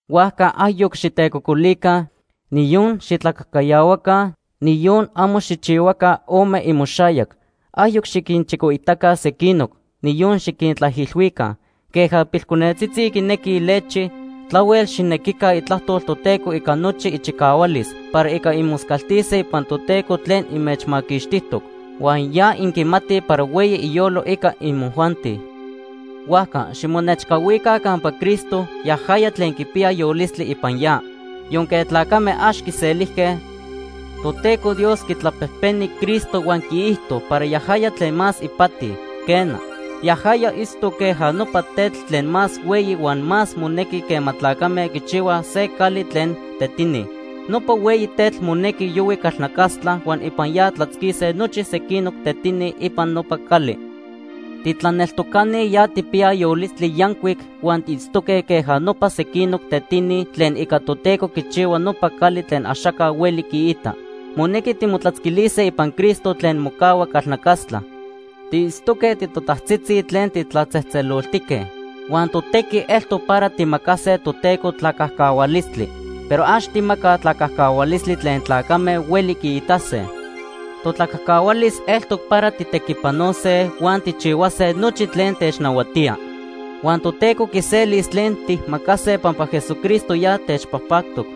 Huajca ayoc xitecocolica, niyon xitlacajcayahuaca, niyon amo xijchihuaca ome imoxayac. Ayoc xiquinchicoitaca sequinoc, niyon xiquintlaijilhuica. Queja pilconetzitzi quinequij lechi, tlahuel xijnequica Itlajtol Toteco ica nochi ichicahualis para ica inmoscaltise ipan Toteco tlen inmechmaquixtijtoc, huan ya inquimatij para hueyi iyolo ica imojuanti. Huajca ximonechcahuica campa Cristo, yajaya tlen quipiya yolistli ipan ya. Yonque tlacame ax quiselijque, Toteco Dios quitlapejpeni Cristo huan quiijto para yajaya tlen más ipati. Quena, yajaya itztoc queja nopa tetl tlen más hueyi huan más monequi quema tlacame quichihuaj se cali tlen tetini. Nopa hueyi tetl monequi yohui calnacastla huan ipan ya tlatzquise nochi sequinoc tetini ipan nopa cali. Titlaneltocani ya tijpiyaj yolistli yancuic huan tiitztoque queja nopa sequinoc tetini tlen ica Toteco quichihua nopa cali tlen axaca hueli quiita. Monequi timotlatzquilise ipan Cristo tlen mocahua calnacastla. Tiitztoque titotajtzitzi tlen titlatzejtzeloltique. Huan totequi eltoc para tijmacase Toteco tlacajcahualistli. Pero ax tijmacaj tlacajcahualistli tlen tlacame hueli quiitase. Totlacajcahualis eltoc para tijtequipanose, huan tijchihuase nochi tlen technahuatía. Huan Toteco quiselis tlen tijmacase pampa Jesucristo ya techpajpactoc.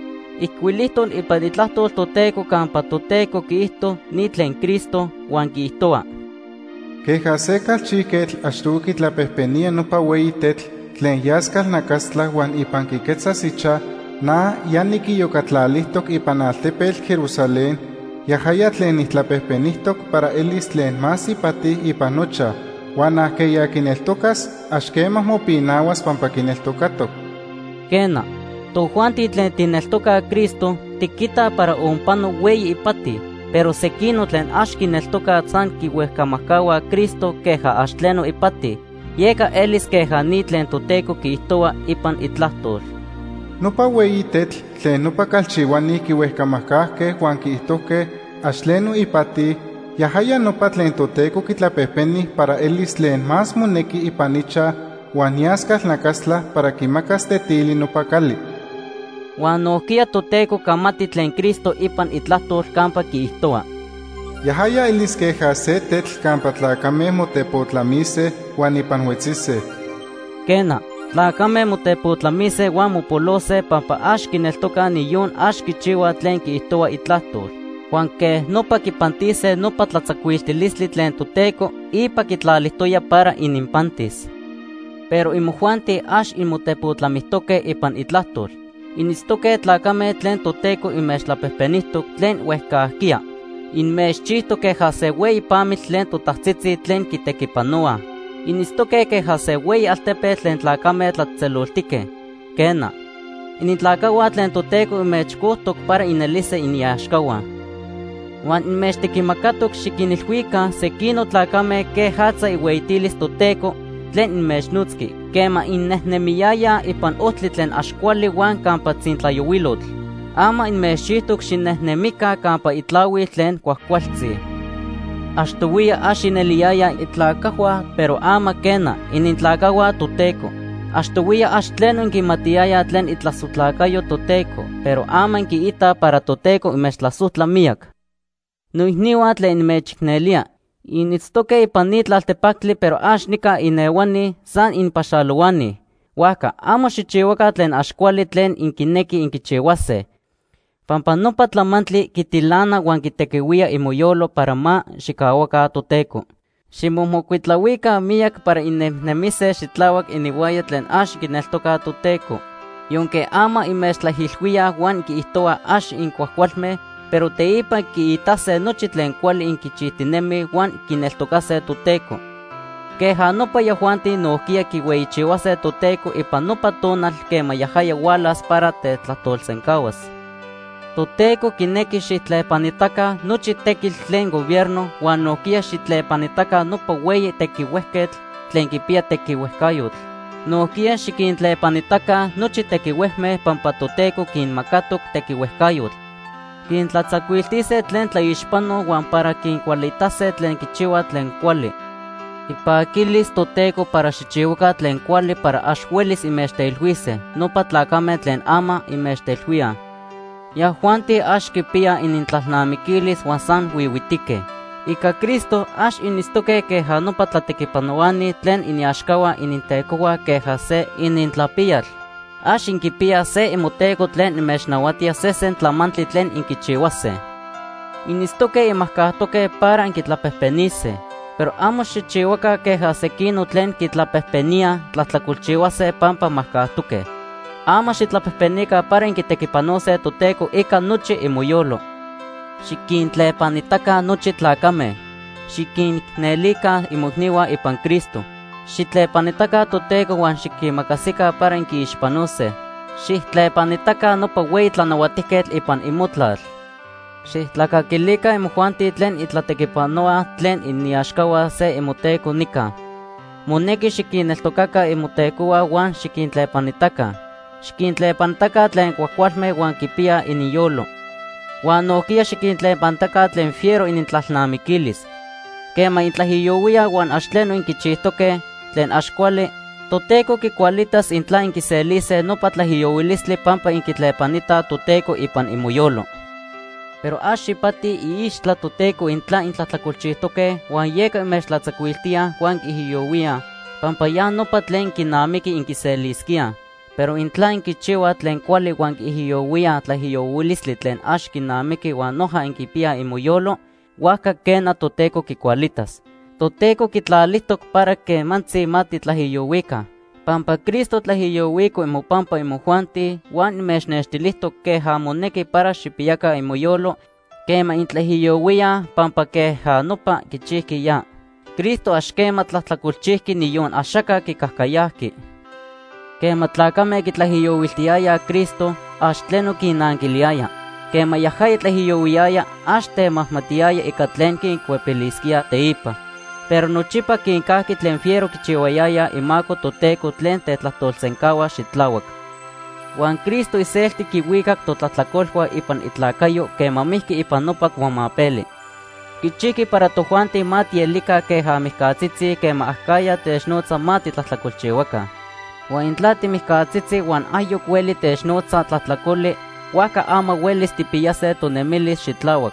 Ijcuilijtoc ipan Itlajtol Toteco campa Toteco quiijto ni tlen Cristo, huan quiijtohua: “Queja se calchijquetl achtohui quitlapejpenía nopa hueyi tetl tlen yas calnacastla huan ipan quiquetzas ichaj, na ya niquiyocatlalijtoc ipan altepetl Jerusalén yajaya tlen nijtlapejpenijtoc para elis tlen más ipati ipan nochaj. Huan ajqueya quineltocas ax quema mopinahuas pampa quineltocatoc.” Quena, tojuanti tlen tijneltocaj Cristo, tiquitaj para onpano hueyi ipati. Pero sequinoc tlen ax quineltocaj, san quihuejcamajcahuaj Cristo queja ax tleno ipati. Yeca elis queja ni tlen Toteco quiijtohua ipan Itlajtol: “Nopa hueyi tetl tlen nopa calchihuani quihuejcamajcajque huan quiijtojque ax tleno ipati, yajaya nopa tlen Toteco quitlapejpeni para elis tlen más monequi ipan ichaj huan yas calnacastla para quimacas tetili nopa cali.” Huan nojquiya Toteco camati tlen Cristo ipan Itlajtol campa quiijtohua: “Yajaya elis queja se tetl campa tlacame motepotlamise huan ipan huetzise.” Quena, tlacame motepotlamise huan mopolose pampa ax quineltocaj niyon ax quichihuaj tlen quiijtohua Itlajtol, huan quej nopa quipantise nopa tlatzacuiltilistli tlen Toteco ipa quitlalijtoya para ininpantis. Pero imojuanti ax inmotepotlamijtoque ipan Itlajtol. Initztoque tlacame tlen Toteco inmechtlapejpenijtoc tlen huejcajquiya. Inmechchijtoc queja se hueyi pamitl tlen totajtzitzi tlen quitequipanohuaj. Initztoque queja se hueyi altepetl tlen tlacame tlatzejtzeloltique. Quena, initlacajhua tlen Toteco inmechcojtoc para inelise iniaxcahua. Huan inmechtequimacatoc xiquinilhuica sequinoc tlacame quejatza ihueyitilis Toteco tlen inmechnotzqui quema innejnemiyayaj ipan ojtli tlen ax cuali huan campa tzintlayohuilotl. Ama inmechchijtoc xinejnemica campa itlahuil tlen cuajcualtzi. Achtohuiya ax ineliyayaj itlacajhua, pero ama quena, initlacajhua Toteco. Achtohuiya ax tleno inquimatiyayaj tlen itlasojtlacayo Toteco, pero ama inquiitaj para Toteco inmechtlasojtla miyac. Noicnihua tlen nimechicnelía. Initztoque ipan ni tlaltepactli pero ax nica inehuani, san inpaxalohuani. Huajca amo xijchihuaca tlen ax cuali tlen inquinequij inquichihuase, pampa nopa tlamantli quitilana huan quitehuía imoyolo para ma xijcahuaca Toteco. Ximomocuitlahuica miyac para innejnemise xitlahuac ininhuaya tlen ax quineltocaj Toteco. Yonque ama inmechtlaijilhuíaj huan quiijtohuaj ax incuajcualme, pero teipa quiitase nochi tlen cuali inquichijtinemij huan quineltocase Toteco. Queja nopa yajuanti nojquiya quihueyichihuase Toteco ipan nopa tonal quema yajaya hualas para tetlajtolsencahuas. Toteco quinequi xijtlepanitaca nochi tequitl tlen gobierno huan nojquiya xijtlepanitaca nopa hueyi tequihuejquetl tlen quipiya tequihuejcayotl. Nojquiya xiquintlepanitaca nochi tequihuejme pampa Toteco quinmacatoc tequihuejcayotl quintlatzacuiltise tlen tlaixpanoj huan para quincualitase tlen quichihuaj tlen cuali. Ipaquilis Toteco para xijchihuaca tlen cuali para ax huelis inmechteilhuise nopa tlacame tlen ama inmechteilhuíaj. Yajuanti ax quipiyaj inintlalnamiquilis huan san huihuitique. Ica Cristo ax initztoque queja nopa tlatequipanohuani tlen iniaxcahua inintecohua queja se inintlapiyal. Ax inquipiyaj se imoteco tlen inmechnahuatía sesen tlamantli tlen inquichihuase. Initztoque inmajcajtoque para inquitlapejpenise, pero amo xijchihuaca queja sequinoc tlen quitlapejpeníaj tlajtlacolchihuase pampa majcajtoque. Ama xijtlapejpenica para inquitequipanose Toteco ica nochi imoyolo. Xiquintlepanitaca nochi tlacame. Xiquinicnelica imoicnihua ipan Cristo. Xijtlepanitaca Toteco huan xiquimacasica para inquiixpanose. Xijtlepanitaca nopa hueyi tlanahuatijquetl ipan imotlal. Xijtlacaquilica imojuanti tlen intlatequipanohuaj tlen iniaxcahua se imoteco nica. Monequi xiquinneltocaca imotecohua huan xiquintlepanitaca. Xiquintlepanitaca tlen cuajcualme huan quipiyaj ininyolo, huan nojquiya xiquintlepanitaca tlen fiero inintlalnamiquilis. Quema intlaijiyohuíaj huan ax tleno inquichijtoque tlen ax cuali, Toteco quicualitas intla inquiselise nopa tlaijiyohuilistli pampa inquitlepanitaj Toteco ipan imoyolo. Pero ax ipati iixtla Toteco intla intlajtlacolchijtoque huan yeca inmechtlatzacuiltíaj huan inquiijiyohuíaj, pampa ya nopa tlen quinamiqui inquiselisquíaj. Pero intla inquichihuaj tlen cuali huan inquiijiyohuíaj tlaijiyohuilistli tlen ax quinamiqui huan noja inquipiyaj imoyolo, huajca quena, Toteco quicualitas. Toteco quitlalijtoc para quemantzi ma titlaijiyohuica. Pampa Cristo tlaijiyohuico imopampa imojuanti huan inmechnextilijtoc queja monequi para xijpiyaca imoyolo quema intlaijiyohuíaj pampa queja nopa quichijqui ya. Cristo ax quema tlajtlacolchijqui, niyon axaca quicajcayajqui. Quema tlacame quitlaijiyohuiltiyayaj Cristo, ax tleno quinnanquiliyaya. Quema yajaya tlaijiyohuiyaya, ax temajmatiyaya ica tlen quincuepilisquía teipa. Pero nochipa quincajqui tlen fiero quichihuiliyayaj imaco Toteco tlen tetlajtolsencahua xitlahuac. Huan Cristo iselti quihuicac totlajtlacolhua ipan itlacayo quema mijqui ipan nopa cuamapeli. Quichijqui para tojuanti ma tielica queja mijcatzitzi quema acajya technotza ma titlajtlacolchihuaca. Huan intla timijcatzitzi huan ayoc hueli technotza tlajtlacoli, huajca ama huelis tijpiyase tonemilis xitlahuac.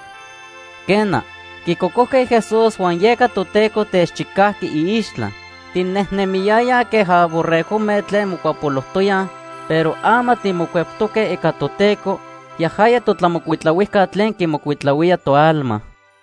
Quena, quicocojque Jesús huan yeca Toteco techchicajqui iixtla. Tinejnemiyayaj queja borregojme tlen mocuapolojtoyaj, pero ama timocueptoque ica Toteco, yajaya totlamocuitlahuijca tlen quimocuitlahuía toalma.